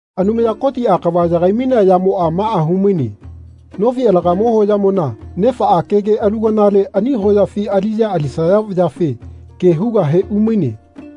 Anumaya Kotiꞌa kava yagai-mainea yamoꞌa maꞌa hu-maine. Nofi alagamo hoyamona nefaꞌa kege aluganale ani hoyafi aliꞌya alisaya vayafe ke hugahe umaine.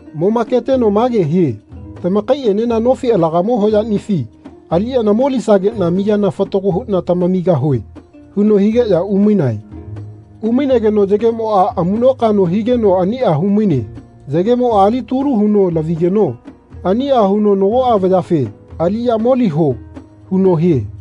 Momaketeno mage hie “Tamakaiꞌenena nofi alagamo hoyaꞌnifi aliꞌya molisageꞌna miyana fatago huꞌna tamamigahue.” huno higeꞌya umainae. Umainageno yagemoꞌa amuꞌnokaꞌno higeno aniꞌa hu-maine. Yagemoꞌa alitulu huno lavigeno aniꞌa huno nagoꞌa vayafe “Aliꞌya moliho.” huno hie.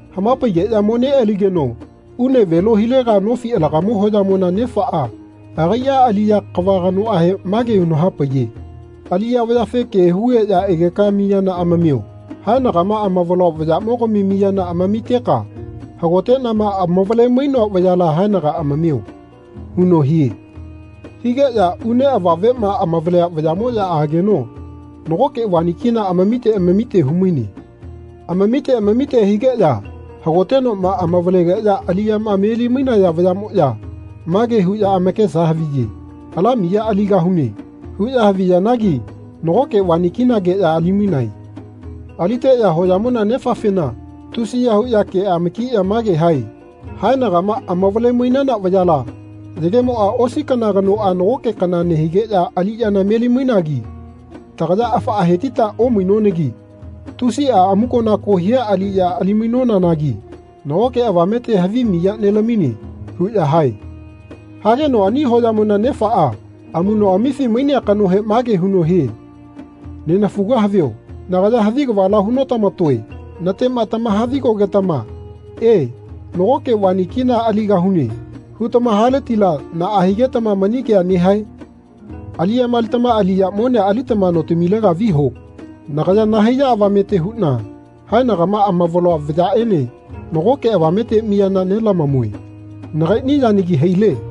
Hama-paigeꞌya mo-neꞌaligeno une velo hilega nofi alagamo hoyamona nefaꞌa agaiꞌa aliꞌya kava kanohe mage huno hapaiye “Aliꞌya vayafe ke hugeꞌya egeka miyana amamio. Haenagama amavaloa vayaꞌmogami miyana amamiteka hagoteꞌnama amavale-mainoa vayala haenaga amamio.” huno hie. Higeꞌya une avavema amavalea vayaꞌmoꞌya ageno nagoke vani kina amamite amamite hu-maine. Amamite amamite higeꞌya hagotenoꞌma amavalegeꞌya aliꞌyama meli-mainaya vayaꞌmoꞌya mage huꞌya amakesa haviye “Ala miya aligahune.” huꞌya haviyanagi nagoke vani kinageꞌya ali-mainae. Aliteꞌya hoyamona nefafena tusiya huꞌya kea-makiꞌya mage hae “Haenagama amavale-mainana vayala yagemoꞌa osi kana kanoꞌa nagoke kana nehigeꞌya aliꞌyana meli-mainagi tagaya afaꞌa hetita omainonagi tusiꞌa amukonako hia aliꞌya ali-mainonanagi nagoke avamete havi miya nelamine.” huꞌya hae. Hageno ani hoyamona nefaꞌa amuꞌnoꞌamifi mainea kanohe mage huno hie “Nenafuga havio nagaya havi kavala hu-notama-toe. Natema tamaha-vi-gogetama ‘E, nagoke vani kina aligahune.’ hutama hagetila naꞌa higetama mani kea nehae? Aliꞌyama alitama aliya monea alitama notamilega viho. Nagaya nahaiya avamete huꞌna haenagama amavaloa vayaꞌene nago avamete miyana nelamamue. Nagaiꞌni yanagi haile.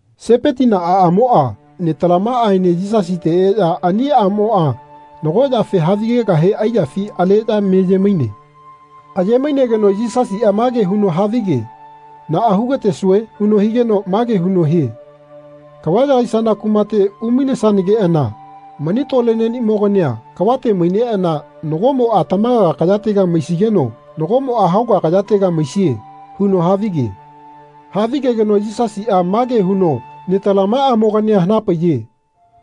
Sepetina aꞌamoꞌa netalamaꞌaene Yisasite eꞌya ani aꞌmoꞌa nago yafe havigegahe aiyafi aleꞌya meye-maine. Aye-mainegeno Yisasiꞌa mage huno havige “Naꞌa hu-gatesue?” huno higeno mage huno hie “Kava yagaisana kumate umainesanageꞌana mani tole neꞌnimogania kavate maineꞌana nagoꞌmoꞌa tamaga kayatega maisigeno nagoꞌmoꞌa hauga kayatega maisie.” huno havige. Havigegeno Yisasiꞌa mage huno netalamaꞌamogania hana-paiye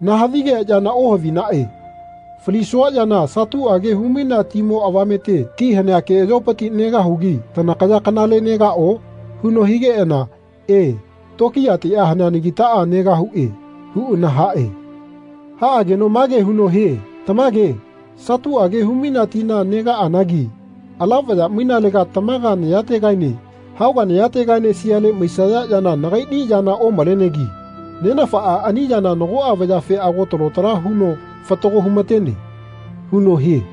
“Nahavi-gea yana ohavinaꞌe. Falisua yana satuꞌage hu-mainea timo avamete ti hanea keꞌayopiti negahugi tanakaya kanale negaꞌo?” huno higeꞌana “E, tokiyatiꞌa haneanagitaꞌa negahuꞌe.” huꞌana haꞌe. Haꞌageno mage huno hie “Tamage satuꞌage hu-mainea tina negaꞌanagi ala vaya mainelega tamaga nayategaene hauga nayategaene siale maisaya yana nagaiꞌni yana omalenegi Nenafaꞌa ani yana nagoꞌa vayafe ago talo tala huno fatago hu-ma-tene.” huno hie.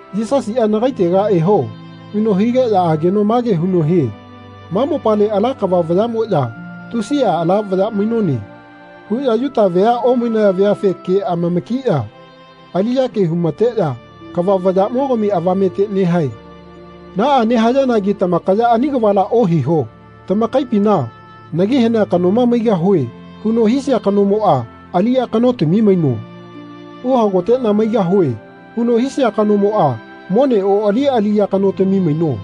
Yisasiꞌa “Nagaitega eho.” huno higeꞌya ageno mage huno hie “Ma mopale ala kava vayaꞌmoꞌya ‘Tusiꞌa ala vaya mainone.’ huꞌya Yuta vea omainaya veafe ke amama-kiꞌya aliꞌya ke hu-ma-teꞌya kava vayaꞌmogami avamete nehae. Naꞌa nehayanagi tamakaya ani kavala ohiho. Tamakaipina ‘Nagi hanea kanoma maigahue.’ huno hisia kanomoꞌa aliꞌya kanotami maino. ‘Uhagoteꞌna maigahue.’ huno hisia kanomoꞌa mone oꞌali aliꞌya kanotami maino.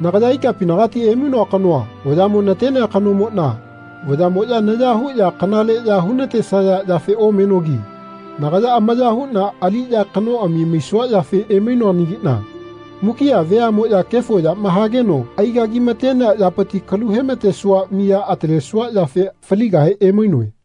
Nagaya ikapinagati emainoa kanoa vayaꞌmo natenea kanomoꞌna vayaꞌmoꞌya naya huꞌya kanaleꞌya hu-na-tesaya yafe omenogi nagaya amaya huꞌna aliꞌya kanoꞌami maisua yafe emainoanagiꞌna mukiꞌa veaꞌmoꞌya kefo yama hageno ai-gagi-ma-tenea yapiti kalu he-ma-tesua miya atalesua yafe faligahe emainoe.”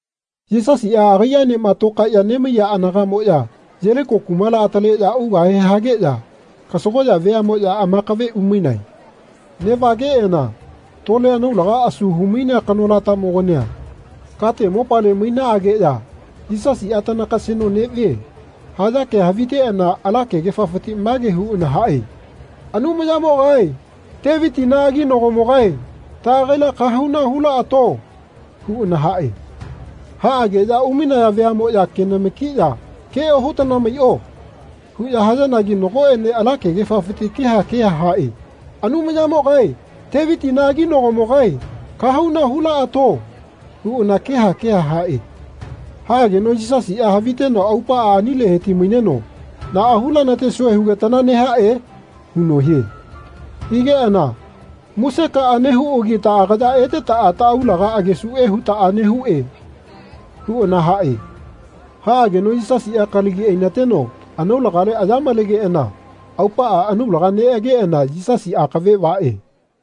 Yisasiꞌa agaiꞌaenema tokaeꞌya nemaiya anagaꞌmoꞌya Yeliko kumala ataleꞌya ugahe hageꞌya kasagoꞌya veaꞌmoꞌya amakave umaine. Neꞌvageꞌana tole anaulaga asu hu-mainea kanolamogania kate mopale mainanageꞌya “Yisasiꞌa tanakaseno neꞌvie.” haya kea haviteꞌana ala kegefafiti mage huꞌana haꞌe “Anumayamogae, Tevitina aginagomogae, taꞌagaila kahauna hu-laꞌato.” huꞌana haꞌe. Haꞌageꞌya umainaya veaꞌmoꞌya kenama-kiꞌya “Ke ohutana maiꞌo.” huꞌya hayanagi nagoꞌene ala kefiti keha keha haꞌe “Anumayamogae, Tevitina aginagomogae, kahauna hulaꞌato.” huꞌana keha keha haꞌe. Haꞌageno Yisasiꞌa haviteno aupaꞌa anile heti-maineno “Naꞌa hu-lana-tesue hugetana nehaꞌe?” huno hie. Higeꞌana “Museka nehuꞌagi taꞌagaya etetaꞌa taꞌaulaga agesuꞌe hutaꞌa nehuꞌe.” huꞌana haꞌe. Haꞌageno Yisasiꞌa kalagi ai-na-teno anaulagale aya malegeꞌana aupaꞌa anaulaga neꞌageꞌana Yisasi akave vaꞌe.